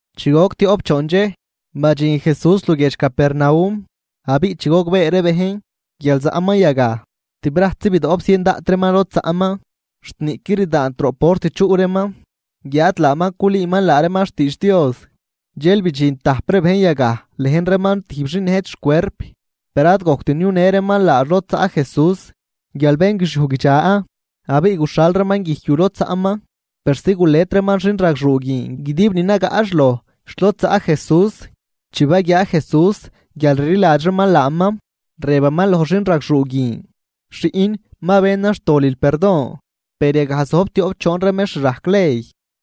Chi goc tioꞌp choon dxej, badxin Jesús luguiedx Capernaum, abiꞌ chi gogbee ree bejn, guial zaꞌman yagaj, tibrajtzi bidoꞌp zien daꞌt reeman lod zaꞌman, xt niꞌquid rdaant roꞌ port chuꞌ reeman, guiáad laaman culüüman laa reeman xtiidx Dios. Dxel bidxin tajp ree bejn yagaj lejn reeman tijb xin nëjt xcuerp. Per ad gojct niunë reeman laax lod zaꞌ Jesús guial bén guixiuj guidxa. Abiꞌ guxhal reeman guijc yu lod zaꞌman persi gulet reeman xinragxuu guin guidib ni nagaꞌx loj xt lod zaꞌ Jesús. Chi baguiaa Jesús guial rliladx reeman laaman, rëbaman loj xinragxuu guin: ―Xiꞌn, ma benan xtolil perdon. Per yagaj zojb tioꞌp choon ree mextr rajc ley,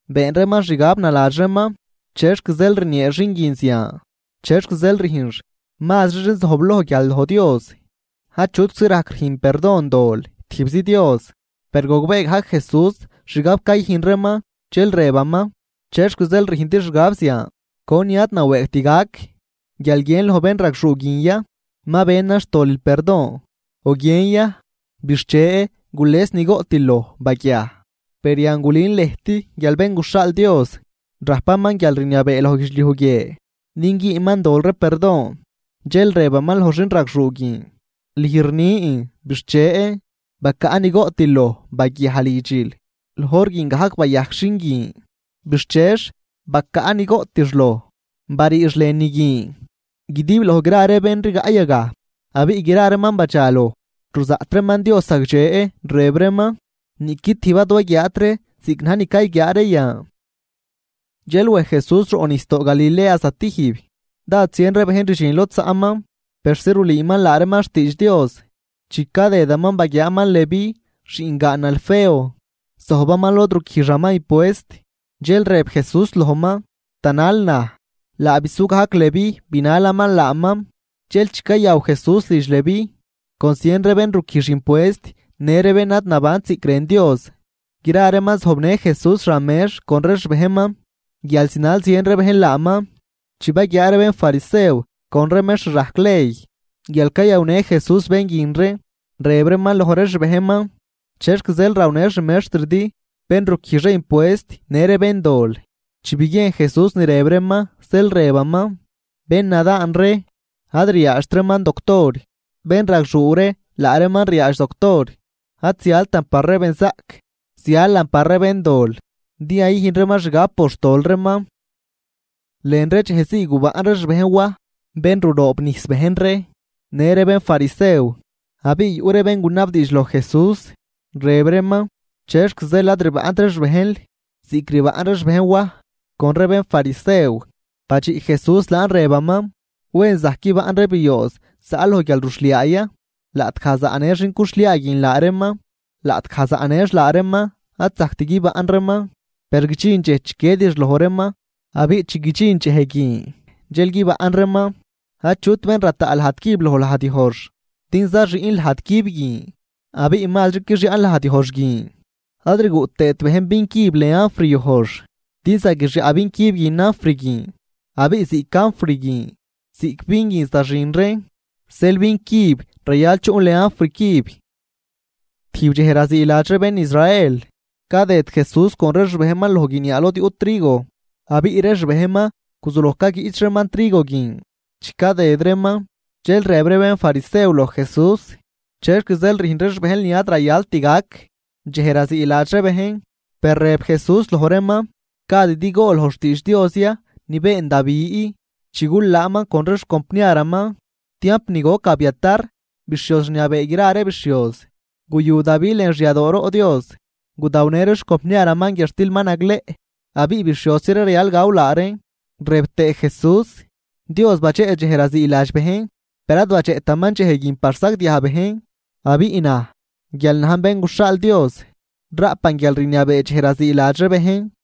been reeman xgab naladx reeman: “¿Chexc zeel rniee xin guin zian? ¿Chexc zeel rüjnx mazri xin zojbloj guial loj Dios? Achutczi rajc rüjn perdon dol tijbzi Dios.” Per gogbee gajc Jesús xgab cayüjn reeman, dxel rëbaman: ―¿Chexc zeel rüjndi xgab zian? ¿Conin ad nawëëgt gac, guial guiën loj bénragxuu guin ya: “Ma benan xtolil perdon”, o guiën ya: “Bixche, gules ni goꞌtil loj, baguiaj”? Per yan gulün lëjt guial Bén guxhaal Dios rajpaman guialrniabee loj guidxliuj guie din güünman dol ree perdon. Dxel rëbaman loj xinragxuu guin: ―Lüj rnin, bixche, bacaꞌ ni goꞌtil loj baguiaj lidxil. Loj hor guin gajc bayajc xin guin, bixchex bacaꞌ ni goꞌtix loj, bariix lënü guin guidib loj gra ree bén rigaꞌ yagaj. Abiꞌ gra reeman badxaloj, ruzaꞌt reeman Dios zagdxe, rëb reeman: ―Niꞌqui tijb ad waguiaat ree ziꞌc na̱j ni cayguiaa ree yan. Dxel wej Jesús roꞌnijsdoo Galilea zatijb. Dád zien ree bejn rdxin lod zaꞌman persi rulüüman laa reeman xtiidx Dios. Chi cadëdaman, baguiaaman Leví xiꞌngaan Alfeo, zojbaman lod ruquijxaman impuest. Dxel rëb Jesús lojman: ―Tanal naj. Laa bisu gajc Leví binalaman laaman. Dxel chi cayaw Jesús lidx Leví con zien ree bén ruquijx impuest në ree bén ad nabant ziꞌc rën Dios, gra reeman zojbnë Jesús xan mex con ree xbejnman, guial zinal zien ree bejn laaman. Chi baguiaa ree bénfarisew con ree mextr rajc ley guial cayawnë Jesús bén guin ree, rëb reeman loj ree xbejnman: ―¿Chexc zeel rawnë xmextridi bén ruquijx ree impuest në ree béndol? Chi biguiejn Jesús ni rëb reeman, zeel rëbaman: ―Bénnadaan ree ad riaadxt reeman doctor, bénragxuu ree, laa reeman riaadx doctor. Ad zialtan par ree benzaꞌc, zialan par ree béndol din yayüjn reeman xgab por xtol reeman. Lën ree dxej zii gubaꞌn ree xbejn Waj bén ruroobnijs bejn ree, në ree bénfarisew. Abiꞌ yuꞌ ree bén gunabdiidx loj Jesús, rëb reeman: ―¿Chexc zeel ad rbaꞌnt ree xbejnl ziꞌc rbaꞌn ree xbejn Waj con ree bénfarisew? Badxiꞌ Jesús laan rëbaman: ―Wen, ¿zajc guibaꞌn ree biooz zaꞌ loj guialruxhliaa ya laꞌtgaj zaꞌnë xin cuxhliaa guin laa reeman? Laꞌtgaj zaꞌnëx laa reeman ad zajct guibaꞌn reeman. Per guidxin dxej chiquiedix loj reeman, abiꞌ chi guidxin dxej guin dxel guibaꞌn reeman. ’Achut bén rataꞌ lajd cüb loj lajd yojx, din zaxüꞌn lajd cüb guin abiꞌ mazri quixyaꞌn lajd yojx guin. Ad rguꞌ tëët bejn vin cüb lën anfr yojx, din zaguixyaꞌ vin cüb guin anfr guin, abiꞌ ziꞌc anfr guin ziꞌc vin guin zaxin reen. Zeel vin cüb rayal chuꞌn lën anfr cüb. Tijb dxej raziiladx ree bén Israel, cadëd Jesús con ree xbejnman loj guiniaa lod yuꞌ trigo, abiꞌ ree xbejnman guzuloj caguiꞌch reeman trigo guin chi cadëd reeman. Dxel rëb ree bénfarisew loj Jesús: ―¿Chexc zeel rüjn ree xbejnl ni ad rayalt gac dxej raziiladx ree bejn? Per rëb Jesús loj reeman: ―¿Gadidi gool loj xtiidx Dios ya ni been Davi chi gulaanman con ree xcompniaraman? Tiamp ni goc Abiatar bixhioz rniabee gra ree bixhioz, guyu Davi lën xyadooroꞌ Dios, gudawnë ree xcompniaraman guiadxtil ma nagleꞌ abiꞌ bixhiosi ree rayal gaw laa reen. Rëb tëë Jesús: ―Dios badxeꞌ dxej raziiladx bejn, per ad badxeꞌtaman dxej guin par sagdiaj bejn. Abiꞌ naj, guial najn Bén guxhaal Dios, raꞌpan guialrniabee dxej raziiladx ree bejn.